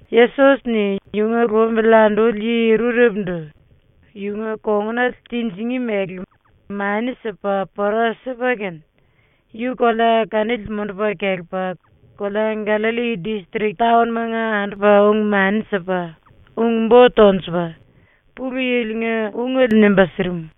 Yesos-ni yunga lumbili anduli yi rurepundu yunga kongunale tinjingí mele mani sipa pora sipa kene, yu kolea kanili mundupa kelepa kolea Gallalli distrik taon-manga andupa ung-mani sipa, ung-bo tonjupa, ⸤Pulu Yili-nga⸥ ungele nimba sirim.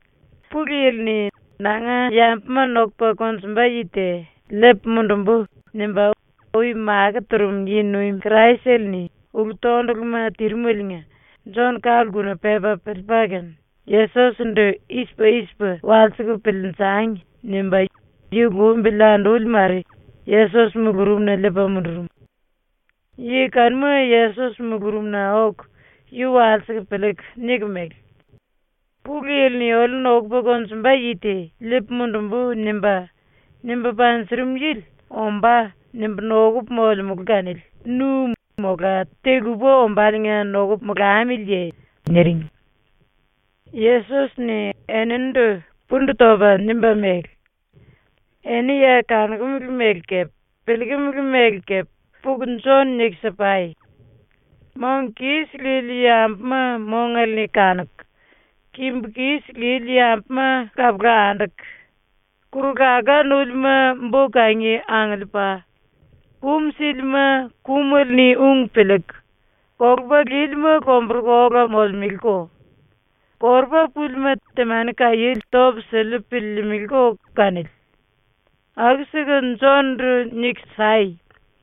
⸤Pulu Yili-ni “Nanga yambuma nokupa konjumba yi te liipu mundumbu.” nimba ui makó turum yi-nuim⸥ Kraisele-ni ulu-tonduluma tirimeliinga Jon ka-lkuna pepa piliipa kene, “Yesos-ndu i-sipa i-sipa walsiku piliinjangi.” nimba yu lumbili anduli mare Yesos mulurumna liipa mundurum. Yi kanuma Yesos mulurumna oku yu walsiku piliiku niku mele: “Pulu Yili-ni oliu nokupa konjumba yi te “Liipu mundumbu.” nimba, nimba panjurum yili ‘Ombá.’ nimbu nokupu molemulu kanili nu mola te-lupa ombáliinga nokupu molamiliye?” niring. Yesos-ni eninindu pundu topa nimba mele: “Eni ya kanokumele mele kepe piliikimili mele kepe puku Jon niku si-pai. Mong kis lili yambuma mongale-ni kanuku, kimbu kis lili yambuma kapula anduku, kuru-laká núlima bo-kangi angiliipa, kum sílima kumele-ni ung piliiku, kolupa lílima lomburuku ola molemeleko, korupa púlima temani kaiéle topu siliu piliilimiliko kanili. Aku-siku Jon-ndu niku sai.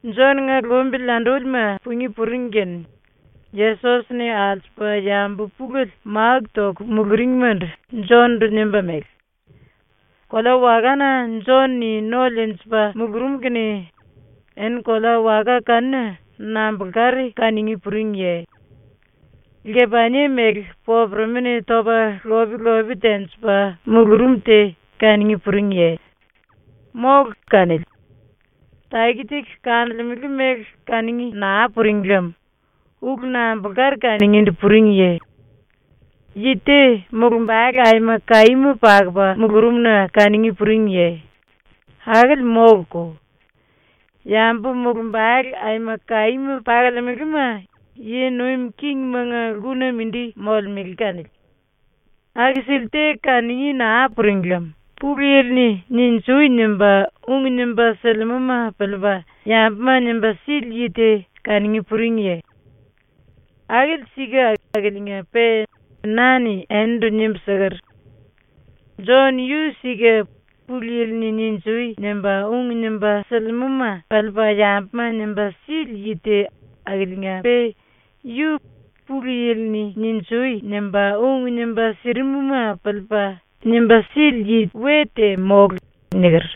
Jon-nga lumbili andúlima pungí puring kene Yesos-ni alsupa yambu pulele máku toku muluringmandu Jon-ndu nimba mele: “⸤Kolea-wakana Jon-ni no liinjipa mulurum kene⸥ eni kolea-waka kanuna nambulkari kanungí puringiye? Lkepanie mele popuremi-ni topa lop-lope tenjipa mulurum te kanungí puringiye? ⸤Mólu kanili. Taki-taki kanolemele mele kanungí naa puring lem⸥ ulu nambulkari kanungíndu puringiye? Yi te mulumbale aima kaíma pakupa mulurum-na kanungí puringiye? Akili móluko. Yambu mulumbale aima kaíma pakolemelema yi nuim kingimanga lkuna mindi molemele kanili. “⸤Aku-sili te kanungí naa puring lem⸥ Pulu Yili-ni “Ninjui!” nimba ung nimba silimúma piliipa yambuma nimba sili yi te kanungí puringiye? Akili sika akiliinga-pe na-ni enindu nimbu siker: “Jon yu sika Pulu Yili-ni “Ninjui!” nimba ung nimba silimúma piliipa yambuma nimba sili yi te akiliinga-pe yu Pulu Yili-ni “Ninjui!” nimba ung nimba sirimuma piliipa nimba sili yi we te mólu.” niker.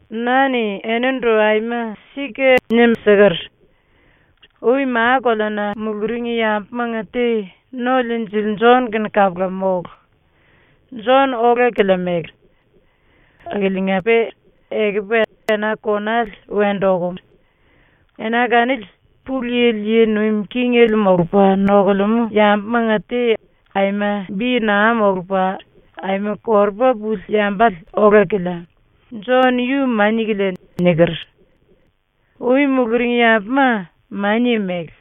Na-ni enindu aima sika nimbu siker: “Ui ma-koleana muluring yambumanga te No-Liinjili Jon-kene kapula mólu. Jon ola-kilia mele. Akiliinga-pe ekupu ena konale wendu okum. Ena kanili Pulu Yili yi nuim kingele molupa nokulemú yambumanga te aima bi naa molupa aima korupa puli yambale ola-kilia; Jon yu mania-kilia.” niker. ⸤Ui muluring yambuma mania mele;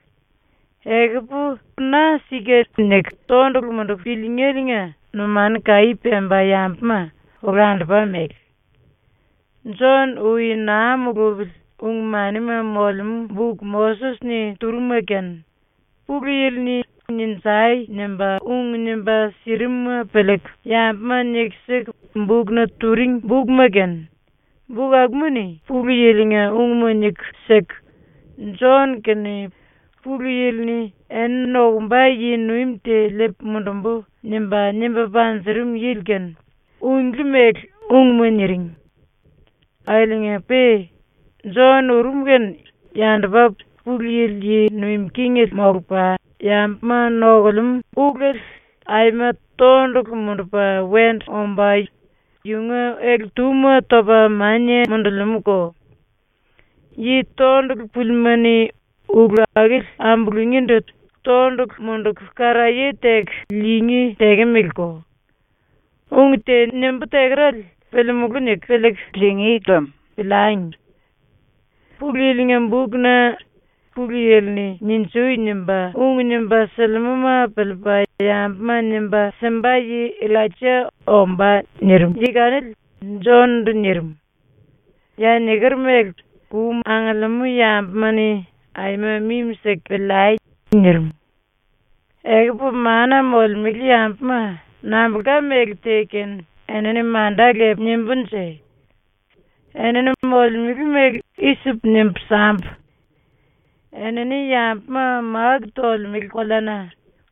ekupu na ‘Sika’ niku tondulu munduku piliingéliinga numanu kaí pemba yambuma olandupa mele.⸥ Jon ui naa mulupili ung-manima molemú buk Moses-ni turum-ma kene, Pulu Yili-ni “Ninjai!” nimba ung nimba sirimuma piliiku yambuma niku siku bukna turing bukma kene, buk akuma-ni Pulu Yili-nga ungma niku siku, Jon kene Pulu Yili-ni “Eni nokumba yi-nuim te liipu mundumbu.” nimba, nimba panjurum yili kene unglí mele ungma niring. Akiliinga-pe Jon urum kene yandupa Pulu Yili yi nuim kingele molupa yambuma nokulemú ulele aima tondulu mundupa wendu omba yunga ele-túma topa mania mundulimúko; yi tondulu púlima-ni ulu akili ambulungíndu tondulu munduku karaye teku liingí tekemeleko. Ung te nimbú tekerale piliimulú niku piliiku liingí lem piliangi. Pulu Yili-nga bukna “⸤Pulu Yili-ni “Ninjui!” nimba ung nimba silimúma piliipa yambuma nimba simba yi⸥ Illaija ombá.” nirim yi kanili Jon-ndu nirim. Ya niker mele kum angiliimú yambuma-ni aima mimi-siku piliai!” ⸤nirim.⸥ “Ekupu mana molemele yambuma nambulka méle te kene enini manda lepu nimbúnje? ⸤Enini molemele mele i-sipu nimbu sambu:⸥ Enini yambuma máku tolemele koleana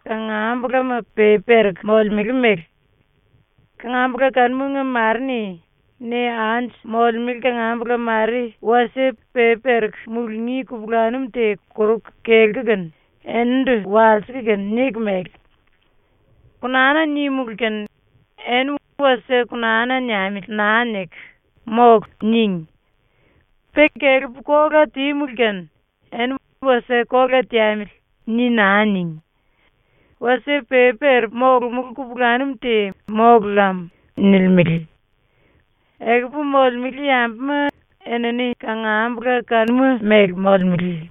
kangambulama pepi pereku molemele mele. Kangambula kanumanga mare-ni ne anju molemele kangambula mare ⸤wasie pepi pereku mulungí kupulanum te koruku kelku kene⸥ eninindu walsiku kene niku mele: “Konana nímulu kene eni ‘Wasie konana niamili.’ naa niku “Mólu.” níngi. Pe kelepu kola tímulu kene eni ‘Wasie kola teamili.’ ni naa níngi. ⸤Wasie pepi perepu molomulú kupulanum te mólu lam.⸥” nilimele. ⸤Ekupu molemele yambuma enini kangambula kanuma mele molemele.⸥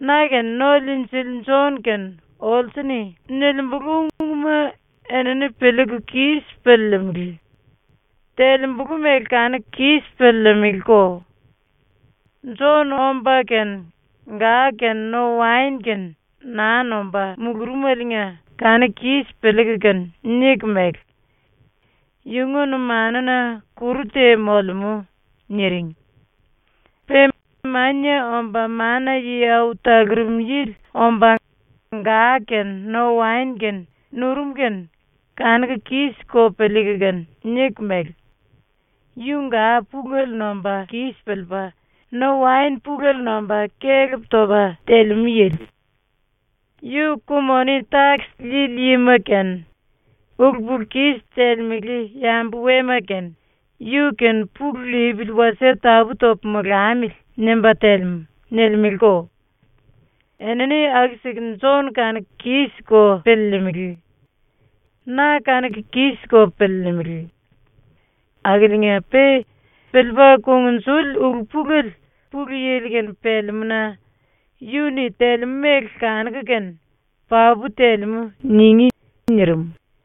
⸤Na kene No-Liinjili Jon kene olsu-ni nilimbulu ungma enini piliiku kis piliilimili; telembulu mele kanuku kis piliilimiliko⸥. Jon omba kene ga kene no-waen kene naa nomba mulurumeliinga ⸤kanuku kis piliiku kene⸥ niku mele: “Yunga numanuna kuru te molemú.” niring. Pe Mania Omba Mana-Yi Au Talurum Yili omba ga kene no-waen kene nurum kene ⸤kanuku kis-ko piliiku kene⸥ niku mele: “Yu ga pulele nomba kis piliipa, no-waen pulele nomba kelep topa telemú yili. Yu ku-moni-takis liili yima kene, ulu-pulu-kis telemele yambu-wema kene ‘Yu-kene pulu lipili wasie tapú-topu molamili.’ nimba telemú.” nilimeleko. ⸤Enini aku-siku Jon kanuku kis-ko piliilimili. Na kanuku kis-ko piliilimili.⸥ Akiliinga-pe piliipa kungnjuli ulu-pulele Pulu Yili-kene pelemú-na yu-ni telemú mele kanuku kene ‘Papu telemú.’ ningí.” nirim.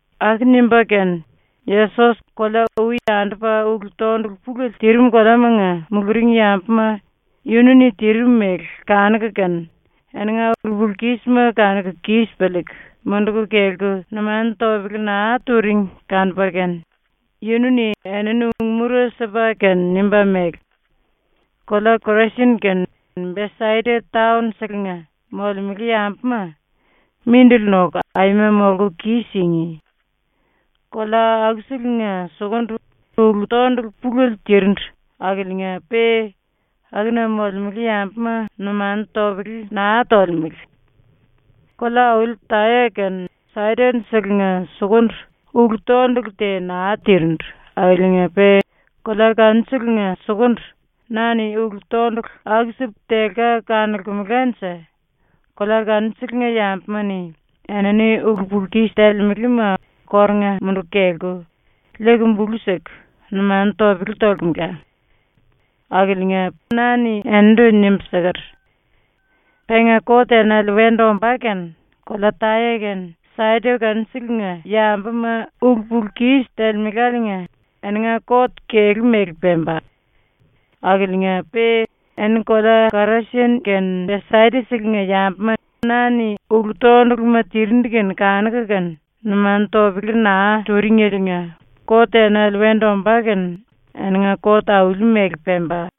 Aku nimba kene Yesos kolea ui andupa ulu-tondulu pulele tirim koleamanga ⸤muluring yambuma⸥ yunu-ni tirim mele kanuku kene eninga ulu-pulu-kísima kanuku kis piliiku munduku kelku numanu topele naa turing kanupa kene yunu-ni enini ung-mura sipa kene nimba mele: “Kolea Korasin kene Besaida taon-selenga ⸤molemele yambuma⸥ mindili noku aima molku kis-singí! Kolea akuselenga sukundu ulu-tondulu pulele tirindu ⸤akiliinga-pe akuna molemele yambuma numanu topele naa tolemele⸥. Kolea-auli Taya kene Saidon-selenga sukundu ⸤ulu-tondulu te naa tirindu akiliinga-pe kolea kanuselenga sukundu⸥ na-ni ulu-tondulu aku-sipu telka kanolkemelanje kolea kanuselenga ⸤yambuma-ni⸥ enini ulu-pulu-kis telemelema kórunga munduku kelku, liiku bulu siku, numanu topele tolkemela. Akiliinga na-ni enindu nimbu siker: “Penga kot enale wendu ombá kene kolea Taya kene Saidon kanuselenga ⸤yambuma ulu-pulu-kis telemeláliinga⸥ eninga kot kelú mele pemba. Akiliinga-pe eni kolea Korasin kene Besaida-selenga ⸤yambuma na-ni ulu-tonduluma tirindu kene kanuku kene numanu topele naa turingeliinga⸥ kot enale wendu ombá kene eninga kot auli-mele pemba.”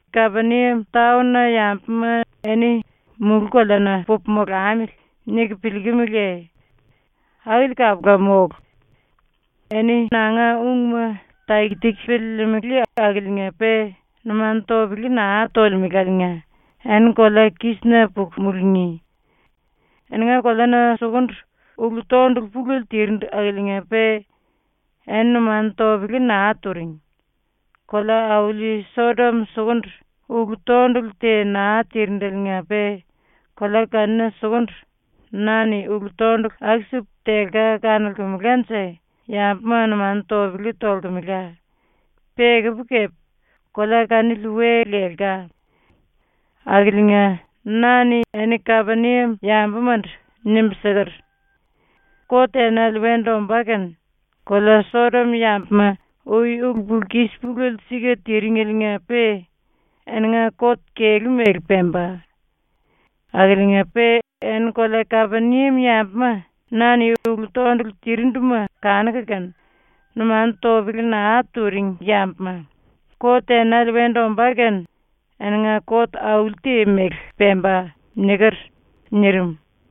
“Kapeniam taon-na ⸤yambuma eni⸥ ‘Mulú-koleana pupu molamili.’ niku piliikimiliye? Akili kapula mólu. ⸤Eni nanga ungma taki-taki piliilimili akiliinga-pe numanu topele naa tolemeláliinga⸥ eni kolea kísina puku mulungí. Eninga koleana sukundu ulu-tondulu pulele tirindu ⸤akiliinga-pe eni numanu topele naa turing⸥. Kolea-auli Sodom sukundu ⸤ulu-tondulu te naa tirindeliinga-pe kolea kanuna sukundu⸥ na-ni ulu-tondulu aku-sipu telka kanolkemelanje yambuma numanu topele tolkemela, pe ekupu kepe kolea kanili we lelka. Akiliinga na-ni eni ⸤Kapeniam yambumandu⸥ nimbu siker: “Kot enale wendu ombá kene kolea Sodom ⸤yambuma ui ulu-pulu-kis pulele sika tiringeliinga-pe⸥ eninga kot kelú mele pemba. Akiliinga-pe eni kolea Kapeniam ⸤yambuma na-ni ulu-tondulu tirinduma kanuku kene numanu topele naa turing yambuma,⸥ kot enale wendu ombá kene eninga kot auli-te mele pemba.” niker.” nirim.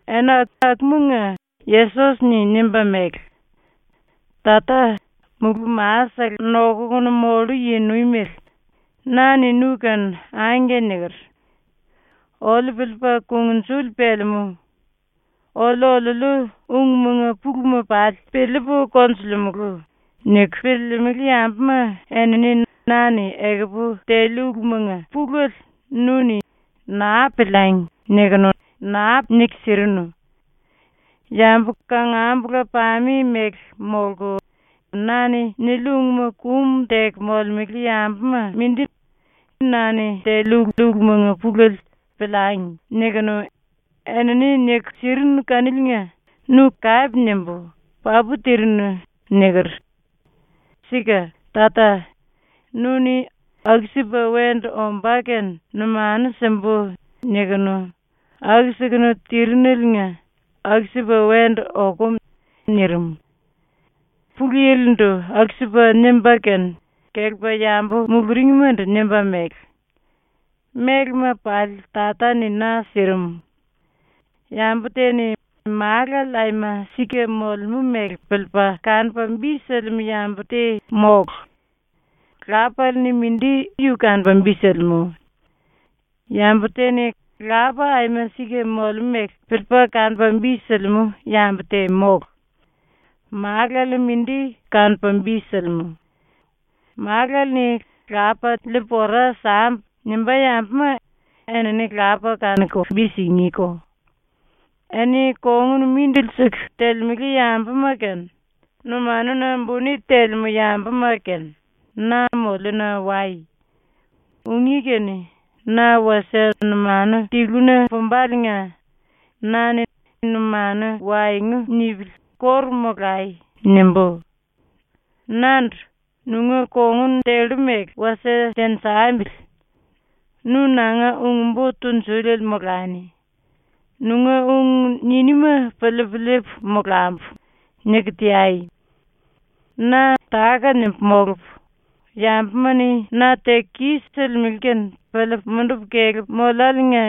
Ena akumanga Yesos-ni nimba mele: “Tata, Mulú-Ma-sele Nokukunu Mollu Yi-Nuimele, na-ni nu-kene ‘Angke’ niker. “Oliu piliipa kungnjuli pelemú. Oliu-oliuliu ungmanga puluma pali piliipu konjulimulu.” niku piliilimili yambuma enini na-ni ekupu teliu ulumanga pulele nu-ni ‘Naa piliangi.’ nikunu naa niku sirinu. Yambu kangambula-pame mele molku na-ni niliu ungma kum teku molemele yambuma mindi na-ni teliu ulumanga pulele ‘Piliangi.’ nikunu, enini niku sirinu kaniliinga nu kape nimbu ‘Papu tirinu.’ niker. Sika, Tata, nu-ni ‘aku-sipa wendu ombá kene numanu simbu.’ nikunu aku-sikunu tirineliinga ⸤aku-sipa wendu okum⸥.” ⸤nirim.⸥ ⸤Pulu Yili-ndu aku-sipa nimba kene kelepa yambu muluringmandu nimba mele:⸥ “Mélema pali Tata-ni na sirim. Yambu te-ni Málale aima sika molemú mele piliipa kanupa bi silimú yambu te mólu; Lapale-ni mindi yu kanupa bi silimú. Yambu te-ni Lapa aima sika molemú mele piliipa kanupa bi silimú yambu te mólu. Málale-ni mindi kanupa bi silimú; Málale-ni ‘Lapa liipu ora sambu.’ nimbá yambuma enini Lapa kanuku bi singíko. “Eni kongun mindili siku telemele yambuma kene, numanuna buni telemú yambuma kene, na moliuna wai. Ungí kene na wasie numanu tiluna pumbaliinga na-ni ‘Numanu waengu nipili kóru molai.’ nimbú. Nandu “Nunga kongun tellu mele wasie tenjambili. Nu nanga ung-bo tunjuliele molani. Nunga ung niníma piliipu liipu molambu.” niku teai. Na táka-nimbu molupu, yambuma-ni na teku kis-silimele kene piliipu mundupu kelepu moliáliinga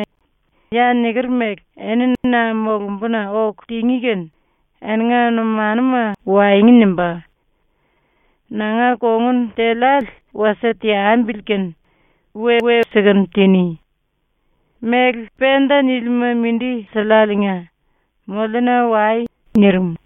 ya niker mele eni na molumbuna oku tingí kene eninga numanuma waengu nimbá. Nanga kongun teliále wasie teambili kene we-we sikunu tiní. Méle penta nílima mindi siliáliinga moliuna wai.” nirim.